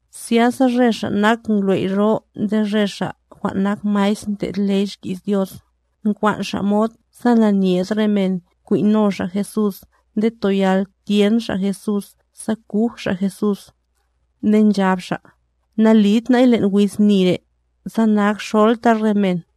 Zyasa re ngwley' jwan' nyebe' nde re xa' jwan' nak maestr ndlo' ley xki's Dios, nkwan' xa' mod sa nanyed re men kwin' no xa' Jesús nde toyal tyen xa' Jesús sa kuj xa' Jesús. Nde nchab xa': —Nalit na'y len' wiz ni re', sa na'akxolta re men.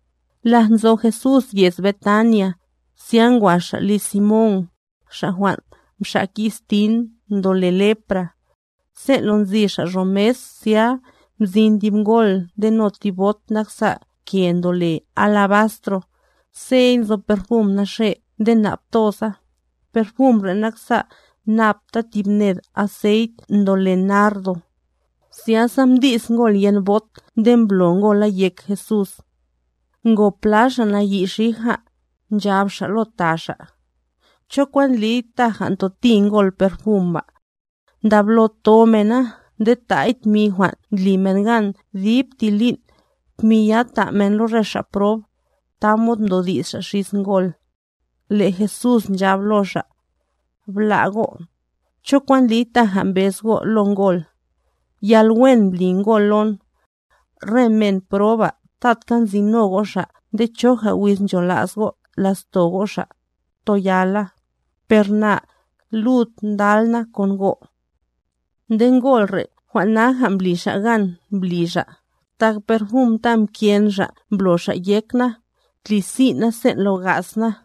Laj nzo Jesús yez Betania, zya ngwa Xa' liz Simón, xa' jwan' mxak yiz tin ndole lepra. Sen' lo nzi xa' ro mes zya mzin tib ngol ndeno tib bot naksa' ke ndole alabastro,c sey nzo perfum naxe' nde nap toza, perfum re' naksa' napta tib ned aceit ndole nardo.d Zyasa mdi's ngol yen bot nde mblo ngola yek Jesús. Ngo pla xa' nayi' xija, nchab xa' lo ta xa': —¿Cho kwan ndliy taja ntoti ngol perfum ba? Ndablo ntho mena nde ta'y tmi jwan' nsina' men dib ti lin', tmi ya ta' men lo re xa' prob, tamod mdodi's xa' xis ngol. Le' Jesús nchab lo xa': —Bla' go', ¿cho kwan ndliy taja mbez go' lo ngol? Yalwen mbli ngol lon. Re men proba tatka nzino go' xa' nde choja wiz nchola's go' la'sto go' xa', toyala; per na, lud ndal na kon go'. Nde ngol re' jwan' naja mbli xa' gan mbli xa', tak perfum ta mken xa' mblo xa' yek na, tli sin' na sen' lo ga's na.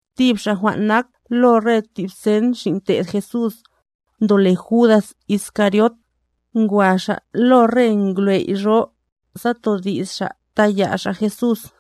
Tib xa' jwan' nak lo re tib sen xin' te'd Jesús, ndole Judas Iscariot, ngwa xa' lo re ngwley' jwan' nyebe', sa todi's xa' taya' xa' Jesús.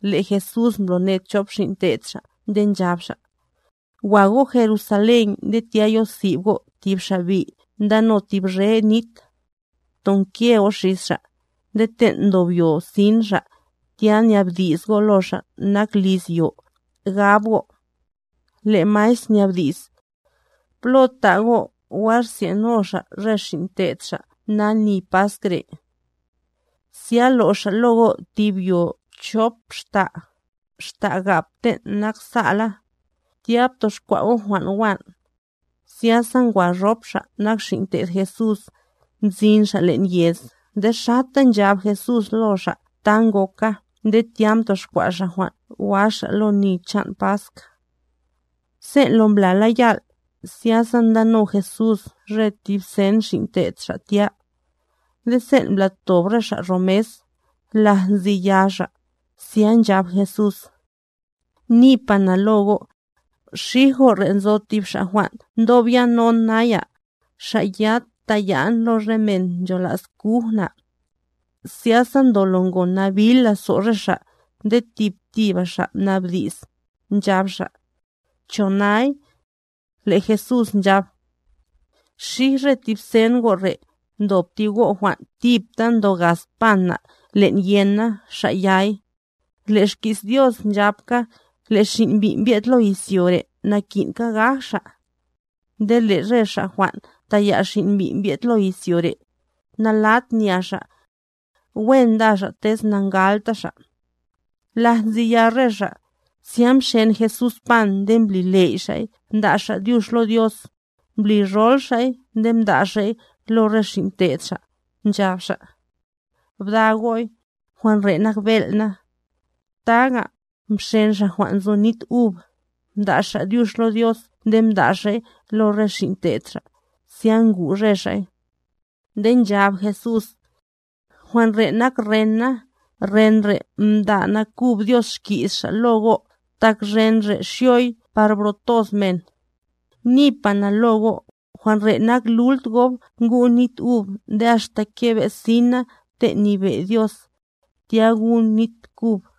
Le' Jesús mbloned chop xin' te'd Xa' nde nchab Xa': —Wa go' Jerusalén nde tya yosib go' tib xa' bi' ndano tib réf nit. Ptonke go' xis xa', nde ten' ndob yo sin xa', tya nyabdi's go' lo xa' nak liz yo, gab go': “Le' Maestr nyabdi's: ¿Plo ta' go' wa rsye'no Xa' re xin' te'd Xa' na ni Pask re'?” Zya lo' xa' lo go' tib yo chop xta', xta' gap ten' naksa'la; tya btoxkwa' go' jwan' wán'. Zyasa ngwa rop xa' nak xin' te'd Jesús, mzin xa' len' yez nde xata nchab Jesús lo xa' ta ngoka nde tya mtoxkwa' xa' jwan' wa xa' lo ni chan' Pask. Sen' lo mbla yal', zyasa ndano Jesús re tib sen xin' te'd Xa' tya. Nde sen' mblatob re xa' ro mes, laj nzi ya xa', zya nchab Jesús: —Nipa na lo go', xij go' re' nzo tib xa' jwan' ndob yanon naya, xa' ya taya'n lo re men nchola's kuj na. Zyasa ndolo ngo nabil lazo' re xa' nde tib tiba xa' mnabdi's, nchab xa': —¿Cho nay? Le' Jesús nchab: —Xij re tib sen go' re', ndob tib go' jwan' tipta ndo gaz pan na' len' yen na, xa' yay. Le' xki's Dios nchabka, le' Xin' Mbi' mbye'd lo izyo re' naki'nka gaj Xa'. ¡Nde le' xa' jwan' taya' Xin' Mbi' mbye'd lo izyo re', nalat nya xa'! Wen nda xa' tez na'ngalta xa'. Laj nzi ya re xa', zya mxen Jesús pan nde mbli ley' Xa'y mda' Xa' dyux lo Dios, mblirol Xa'y nde mda' Xa'y lo re xin' te'd Xa', nchab Xa': —Bda go'y, jwan' re' nak bel' na. Taga, mxen Xa' jwan' nzo nit ub, mda' Xa' dyux lo Dios nde mda' Xa'y lo re xin' te'd Xa', zya ngu' re xa'y. Nde nchab Jesús: —Jwan' re' nak ren na, ren re' mda' nakub Dios xki's Xa' lo go', tak ren re' xyoy par bro toz men. Nipa na lo go', jwan' re' nak lult gob ngun nit ub nde axta kebe' sin na ten' nyebe' Dios, tya gun' nit kub.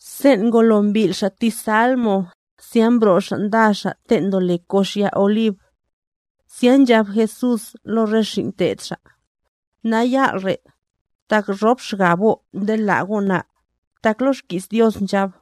Sen' ngolo mbil' xa' ti salmo, zya mbro' xa' nda xa' ten' ndole kox ya Olib. Zya nchab Jesús lo re xin' te'd Xa': —Nayal' re', tak rop xgab go' nde la' go' na; tak lo xki's Dios nchab: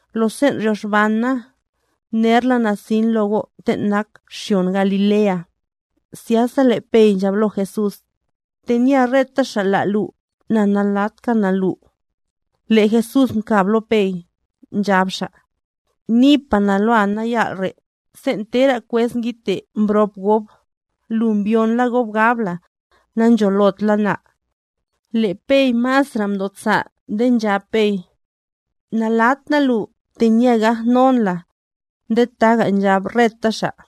Lo sen' ryoxban na, nerla na sin lo go' ten' nak xyon Galilea. Zyasa le' Pey nchab lo Jesús: —¡Tenye reta xa' la' lu, na na'latka na lu! Le' Jesús mkab lo Pey, nchab Xa': —Nipa na loa nayal' re', sen' tera kwez ngidte' mbrop gob, lu mbyon la gob gab la, nancholot la na. Le' Pey masra' mdosa' nde nchab Pey: —Nalat na lu, tenye gajnon la. Nde taga nchab reta xa'.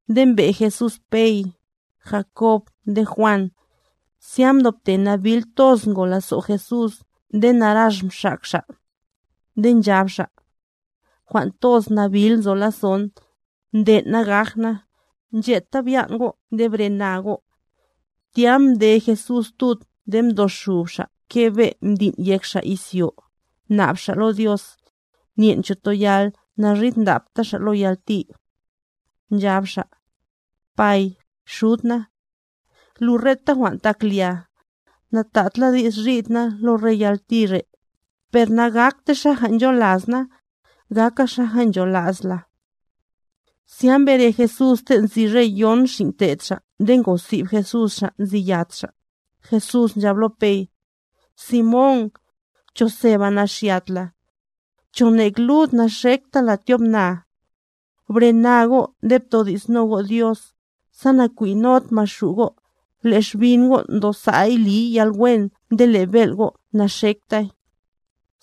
Nde mbe' Jesús Pey, Jacob nde Juan, zya mdobte nabil toz ngo lazo' Jesús nde narax mxak Xa'. Nde nchab Xa': —Jwan' toz nabil nzo lazo'n, nden' na gaj na; ncheta byan' go' nde brena go'. Tya mde Jesús tud nde mdoxub Xa' kebe' ndin' yek Xa' izyo, mnab Xa' lo Dios, nyen' cho toyal naridndapta Xa' lo yalti. Nchab Xa': —¡Pay, Xud na! Lu reta jwan' tak lia; natad la di's rid na lo re yalti re', per nagaktay xaja ncholas na, gaka xaja nchola's la. Zya mbere Jesús ten' nzi re yon xin' te'd Xa' nde ngosib Jesús xa' nzi yat xa'; Jesús nchab lo Pey: —Simón, ¿cho seba naxyat la? ¿Cho nek lud naxekta la tyobnaa? Brena go' nde ptodi'sno go' Dios, sa nakwin'nod Maxu' go'; le' xbin go' ndosa'y liy yalwen nde le' bel' go' naxektay.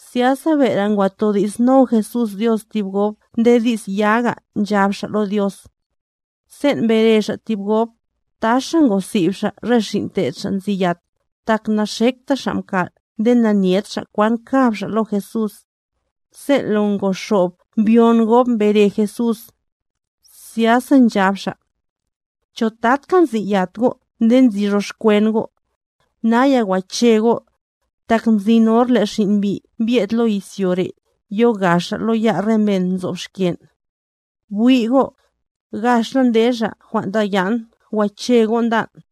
Zyasa bere ngwa todi'sno Jesús Dios tib gob nde di's yaga nchab Xa' lo Dios. Sen' mbere Xa' tib gob, taxa ngosib Xa' re xin' te'd Xa' nzi yat, tak na'xekta xa' mkal' nde nanyet xa' kwan kab xa' lo Jesús. Sen' lo ngoxob mbyon gob mbere Jesús, zyasa nchab Xa': —¿Cho tatka nzi yat go' nde nzi roxkwen go'? ¡Naya wache go'! Tak mzin hor le' Xin' Mbi' mbye'd lo izyo re' yoga Xa' lo ya' re men nzob xken'. Bwi' go', gax la nde xa' jwan' taya'n, wache go', ndan'.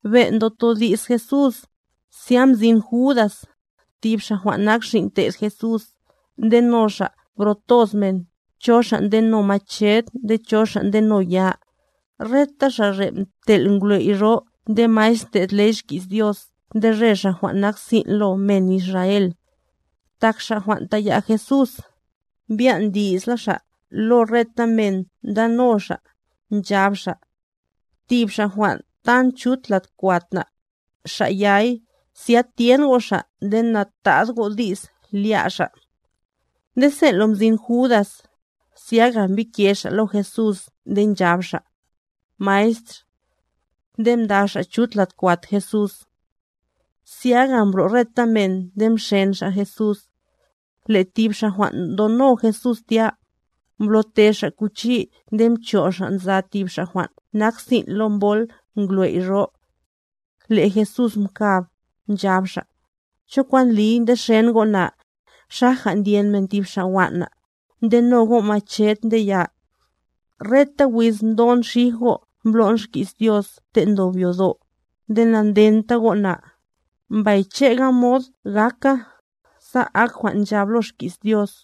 Ben' ndotodi's Jesús, zya mzin Judas, tib xa' jwan' nak xin' te'd Jesús, ndeno xa' bro toz men, cho xa' ndeno mached nde cho xa' ndeno ya, reta xa' re' mtel' re ngwley' jwan' nyebe' nde maestr ndlo' ley xki's Dios nde re xa' jwan' nak sin' lo men Israel. Tak xa' jwan' taya' Jesús, mbyan' di'sla xa' lo reta men ndano xa', nchab xa': —Tib Xa' jwan' tan chut lad kwat na, Xa' yay; zya tyen go' Xa' nde natad go' di's lya' Xa'. Nde sen' lo mzin Judas, zyaga mbike xa' lo Jesús nde nchab xa': —¡Maestr! Nde mda' xa' chut lad kwat Jesús. Zyaga mbro' reta men nde mxen xa' Jesús. Le' tib xa' jwan' ndono Jesús tya, mblo'te xa' kuchi nde mcho' xa' nza tib xa' jwan' nak sin' lo mbol ngwley' ro. Le' Jesús mkab, nchab Xa': —¿Cho kwan ndliy ndexen go' na, xaja ndyen men tib xa' wan' na, ndeno go' mached nde ya? Reta wiz mdon xij go' mblo'n xki's Dios ten' ndob yodo', nde nandenta go' na; mbay che'ga mod gaka, sa ak jwan' nchab lo xki's Dios.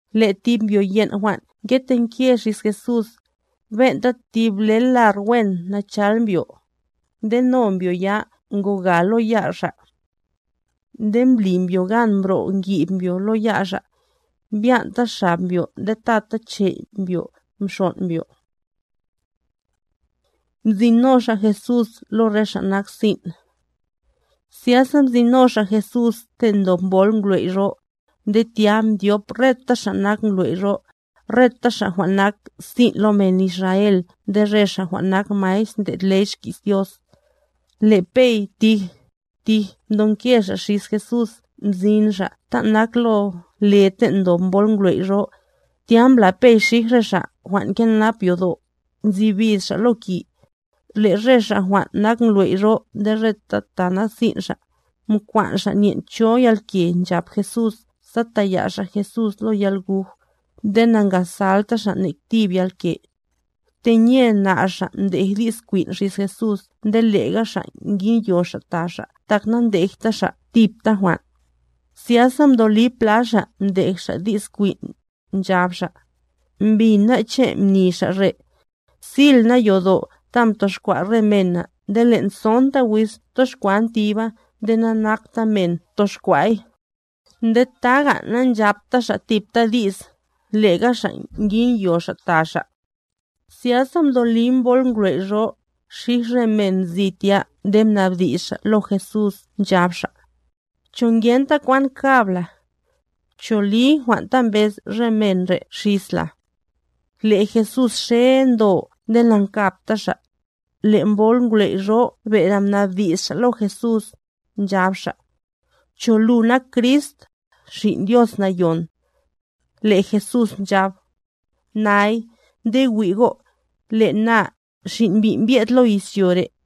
Le' tib mbyo yen' jwan' ngetenke xis Jesús, ben'ta tib ble lar wen nachal mbyo; nde no mbyo ya ngoga lo ya' xa'. Nde mbli mbyo gan mbro'ngib mbyo lo ya' xa', mbyan'ta xab mbyo nde tata chey' mbyo mxon' mbyo. Mzin no xa' Jesús lo re xa' nak sin' Zyasa mzin no xa' Jesús ten' ndob mbol ngwley' ro; nde tya mdyop re ngwley' jwan' nyebe', reta xa' jwan' nak sin' lo men Israel nde re xa' jwan' nak maestr ndlo' ley xki's Dios. Le' Pey tij, tij mdonke xa' xis Jesús mzin xa' ta' nak lo le ten' ndob mbol ngwley' ro; tya mbla Pey xij re xa' jwan' nkenap yodo', nzi bis xa' lo ki. Le' re xa' jwan' nak ngwley' nyebe' nde reta ta nak sin' xa', mkwan' xa' nyen' cho yalke nchap Jesús sa taya' xa' Jesús lo yalguj, nde na'ngasalta xa' nek tib yalke. Tenye nar xa' mdej di's kwin' xis Jesús nde lega xa' nginyo xa' ta xa' tak na'ndejta xa' tipta jwan'. Zyasa mdoli pla xa' mdej di's kwin', nchab xa': —Mbin ná' che' mni xa' re': “Sil na yodo' ta mtoxkwa' re mena nde len' sonta wiz toxkwan tiba nde nakta men toxkwa'y.” Nde taga na'nchapta xa' tipta di's, lega xa' nginyo xa' ta xa'. Zyasa mdoli mbol ngwley' ro, xij re men nzi tya nde mnabdi's xa' lo Jesús nchab xa': —¿Cho ngenta kwan kab la? ¿Cho li jwan' ta mbez re men re' xisla? Le' Jesús xe ndo nde na'nkabta Xa'. Le' mbol ngwley' ro bere mnabdi's xa' lo Jesús, nchab xa': —¿Cho lu nak Crist, Xin' Dios Nayon? Le' Jesús nchab: —Nay; nde wi' go', le' na, Xin' Mbi' mbye'd lo izyo re',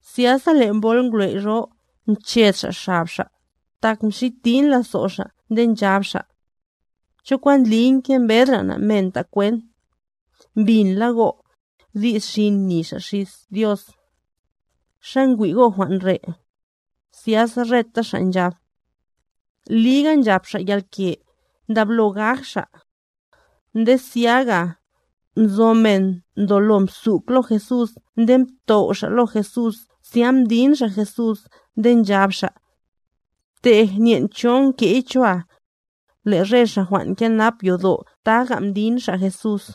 Zyasa le' mbol ngwley' ro, mched xa' xab xa', tak mxitin lazo' xa' nde nchab xa': —¿Cho kwan ndliy ngembedra' ná' men ta' kwent? ¡Mbinla go', di's xin mni Xa' xis Dios! ¿Xa ngwi' go' jwan' re'? Zyasa reta xa' nchab: —¡Liga nchap Xa' yalke, ndablo gaj Xa'! Nde zyaga, nzo men ndolo mzuk lo Jesús nde mtow' xa' lo Jesús zya mdin xa' Jesús nde nchab xa': —¡Btej, nyen' cho nke'y choa! Le' re xa' jwan' nkenap yodo' taga mdin xa' Jesús.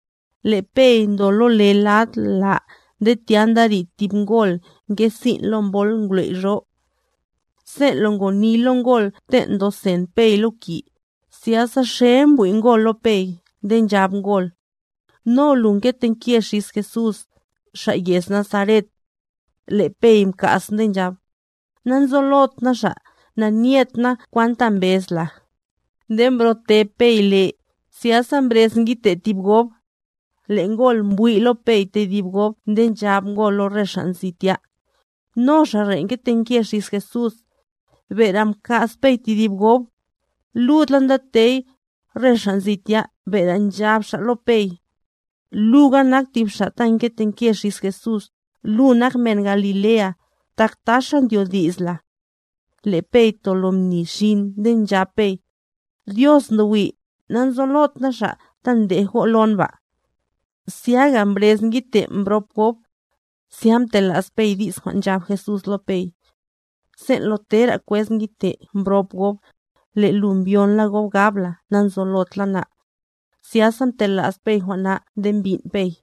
Le' Pey ndo lo le lad la nde tya nda rid tib ngol nge sin' lo mbol ngwley' ro. Sen' lo ngoni lo ngol ten' ndo sen Pey lo ki, zyasa xe mbwi' ngol lo Pey nde nchab ngol: —No lu mketenke xis Jesús, xa' yez Nazaret. Le' Pey mka's nde nchab: —Nanzolot na Xa', nanyet na kwan ta mbez la. Nde mbro'te Pey le; zyasa mbrez ngidte' tib gob. Le' ngol mbwi' lo Pey tedib gob nde nchab ngol lo re xa' nzi tya: —No xa' re' mketenke xis Jesús. Bere mka's Pey tedib gob. Lud la ndatey, re xa' nzi tya bere nchab xa' lo Pey: —Luga nak tib xa' ta mketenke xis Jesús; lu nak men Galilea, tak taxa ndyodi's la. Le' Pey tolo mni xin nde nchab Pey: —¡Dios ndo wi', nanzolot na Xa' ta ndej go' lon ba! Zyaga mbrez ngidte' mbrop gob. Zya mtela's Pey di's jwan' nchab Jesús lo Pey: “Sen' lo tera kwez ngidte' mbrop gob, le' lu mbyonla gob gab la nanzolot la na.” Zyasa mtela's Pey jwan' na nde mbin' Pey.